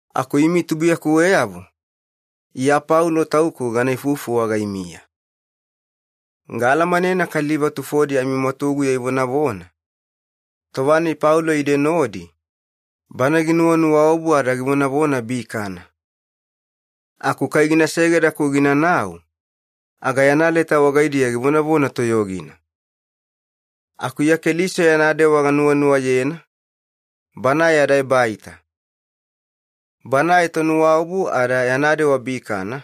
Aku imi tubuiyakuweyavo, Iya Paulo tauku gana ifufu wagaimiya. Gaalamanena kaliva tufodi amimwatuguya ivonavona, “Tova-nai Paulo ide nodi, bana ginuwanuwaobu ada givonavona bikana. Aku kai gina segeda-ku ginanau, aga yana leta wagaidiya givonavona toyogina.” Aku Iya Keliso yana dewa ganuwanuwayena, Banae yada ebaita. Banae tonuwaobu ada yana dewa bikana,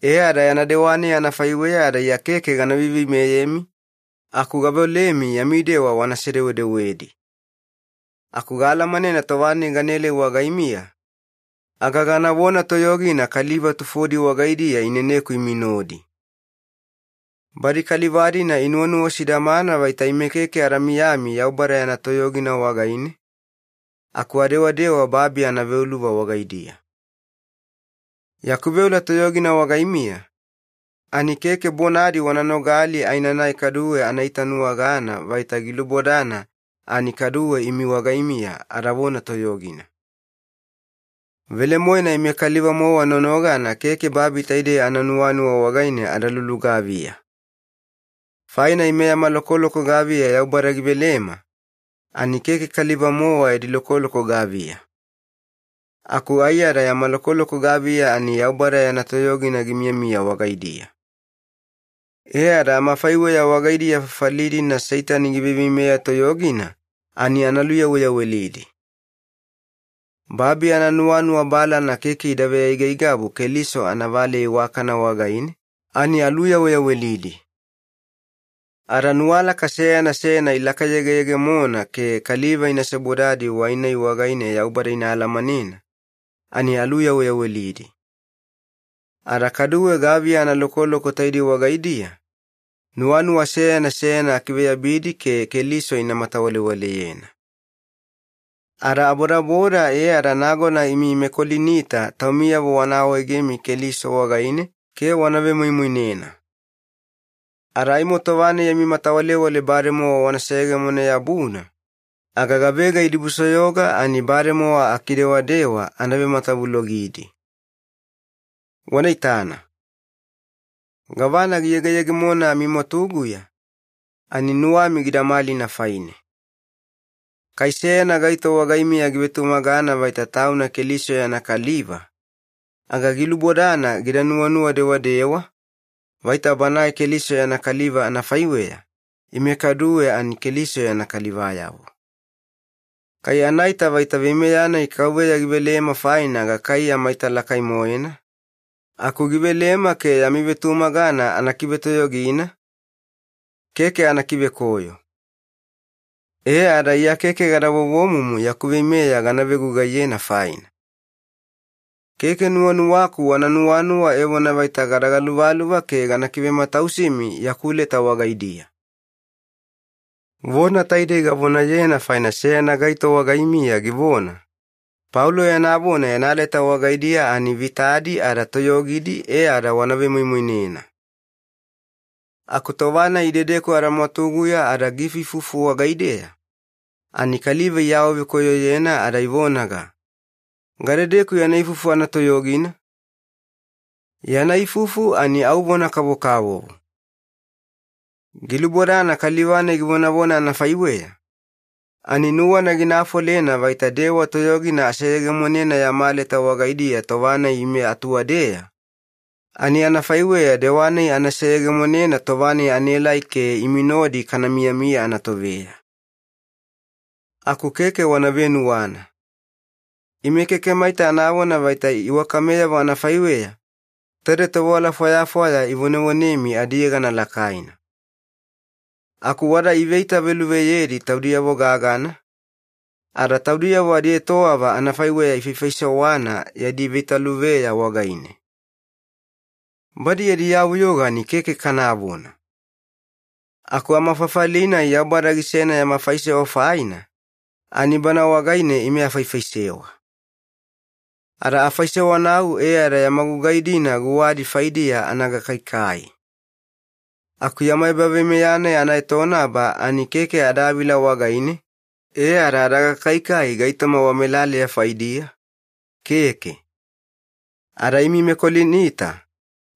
e ada yana dewa-nai anafaiweya ada Iya keke gana veiveimeyemi, aku gaveolemi yami dewa wana sedewedewedi. Aku gaalamanena tova-nai ganaelai wagaimiya, aga ganavona toyogina kaliva tufodi wagaidiya ineneku imi nodi. Badi kaliva-dina inuwanuwa sidamana vaita ime keke ada miyami Yaubada yana toyogina wagaine, aku adewadewa babi anaveuluva wagaidiya. Yaku veola toyogina wagaimiya, ani keke bonadi wana nogali aenanai kaduwe ana itanuwagana vaita gilubodana ani kaduwe imi wagaimiya adavona toyogina. Velemoena ime kaliva-mowa nonogana keke babi taidei ananuwanuwa wagaine ada lulugaviya. Faina ime yama lokoloko gaviya Yaubada givelema, ani keke kaliva-mowa yadi lokoloko gaviya. Aku aiyada yama lokoloko gaviya ani Yaubada yana toyogina gimiyamiya wagaidiya. E ada amafaiweya wagaidiya fafali-dina Seitani giveiveimeya toyogina ani ana luyaweyawelidi. Babi ananuwanuwa balana keke ida veaigaigabu Keliso anavaleya iwakana wagaine, ani aluyaweyawelidi. Ada nuwalaka seyana seyana ilakayegeyegemona ke kaliva ina sebodadi wai-nai wagaine Yaubada ina alamanena, ani aluyaweyawelidi. Ada kaduwe gaviya analokoloko taidei wagaidiya, nuwanuwa seyana seyana akiveyabidi ke Keliso ina matawalewaleyena. Ada abodaboda e ada nagona imi meKolinita taumiyavo wana awaegemi Keliso wagaine ke wana vemoimoinena. Ada aimo tova-nai yami matawalewale bademowa wana seyegemone-yabuna, aga gavega idibusoyoga ani bademowa akidewadewa ana vematavulogidi. Wana itana. Gavana giyegeyegemona amimwatuguya, ani nuwami gida malina faine. Kai seyana gaito wagaimiya givetumagana vaita tauna Keliso yana kaliva, aga gilubodana gida nuwanuwa dewadewa, vaita banae Keliso yana kaliva anafaiweya, ime kaduwe ani Keliso yana kalivayavo. Kai anaita vaita veimeya-nai Kauveya givelema faina gakaiya maita lakai-moena, aku givelema ke yami vetumagana ana kivetoyogina, keke ana kivekoyo. E ada Iya keke gada vovomumu yaku veimeya gana vegugaiyena faina. Keke nuwanuwaku wana nuwanuwa evona vaita gada galuvaluva ke gana kivematausimi yaku leta wagaidiya. Vona taidei gavonayena faina seyana gaito wagaimiya givona, “Paulo yana vona yana leta wagaidiya ani vitadi ada toyogidi e ada wana vemoimoinena. Aku tova-nai idedeku adamwatuguya ada giifuifufu wagaideya, ani kaliva iawavekoyoyena ada ivonaga, ‘Gadedeku yana ifufu anatoyogina? Yana ifufu ani au vona kavokavovo.’” Gilubodana kaliva-nai givonavona anafaiweya, ani nuwana gina afolena vaita dewa toyogina aseyegemonena yama leta wagaidiya tova-nai ime atuwadeya, ani anafaiweya dewa-nai ana seyegemonena tova-nai anaelai ke imi nodi kana miyamiya anatoveya. Aku keke wana venuwana. Ime keke maita anavona vaita iwakameyavo anafaiweya taide tovewala fwayafwaya ivonevonemi adiyegana lakaina. Aku wada iveitaveluveyedi taudiyavo gagana, ada taudiyavo adietowava anafaiweya ifaifaisewana yadi veitaveluveya wagaine. Badi yadi yavuyoga ani keke kanavona! Aku amafafali-nai Yaubada gisena yama faisewa faina, ani bana wagaine ime afaifaisewa. Ada afaisewanau e ada yama gugai-dina guwadi faidiya ana gakaikai. Aku yama ebaveimeya-nai anaetonaba ani keke adavila wagaine e ada adagakaikai gaitoma wamelaleya faidiya, keke. Ada imi meKolinita,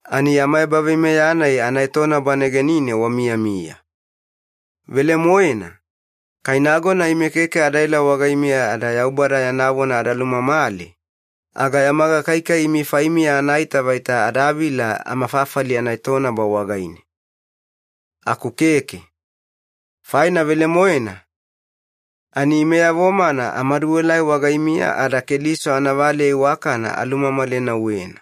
ani yama ebaveimeya-nai anaetonaba negenine wamiyamiya. Velemoena, kai nagona ime keke adaela wagaimiya ada Yaubada yana vona ada lumamale, aga yama gakaikai imi faimiya anaita vaita adavila amafafali anaetonaba wagaine. Aku keke. Faina velemoena, ani imeyavo-mana amaduelai wagaimiya ada Keliso anavaleya iwakana alumamalenauwena.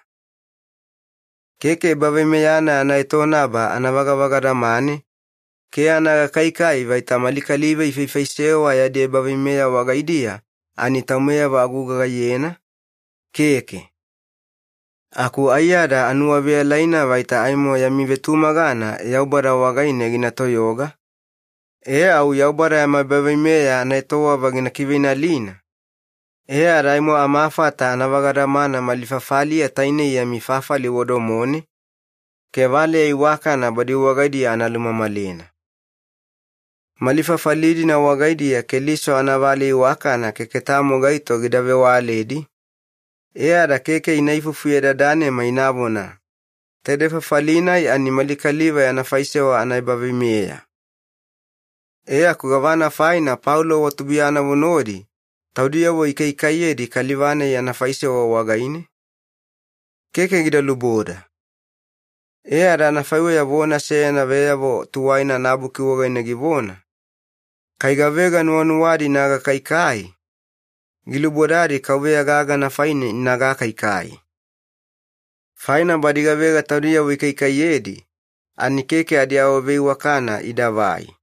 Keke ebaveimeya-nai anaetonaba ana vagavagadamane ke ana gakaikai vaita mali kaliva ifaifaisewa yadi ebaveimeya wagaidiya ani taumeyavo agugaiyena, keke. Aku aiyada anuwaveyalaina vaita aimo yami vetumagana Yaubada wagaine gina toyoga, e au Yaubada yama ebaveimeya anaetowava gina kiveinalina, e ada aimo amafata ana vagadamana mali fafaliya tainei yami fafali wadomone, ke valeya iwakana badi wagaidiya ana lumamalena. Mali fafali-dina wagaidiya Keliso anavaleya iwakana keke tamo gaito gida vewaledi, e ada keke ina ifufuyedadanema inavona, “Taidei fafali-nai ani mali kaliva yana faisewa anaebaveimeya. E aku gavana faina Paulo wa tubuiyanavo nodi taudiyavo ikaikaiyedi kaliva-nai yana faisewa wagaine? Keke gida luboda.” E ada anafaiweya vona seyana Veyavo Tuwaina anaBuki wagaine givona, “Kai gavega nuwanuwadi ina gakaikai, gilubodadi KAUVEYA gagana faine ina gakaikai.” Faina badi gavega taudiyavo ikaikaiyedi ani keke adiawaveiwakana idavai.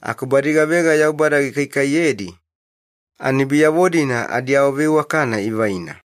Aku badi gavega Yaubada gikaikaiyedi ani biyavo-dina adiawaveiwakana ivaina.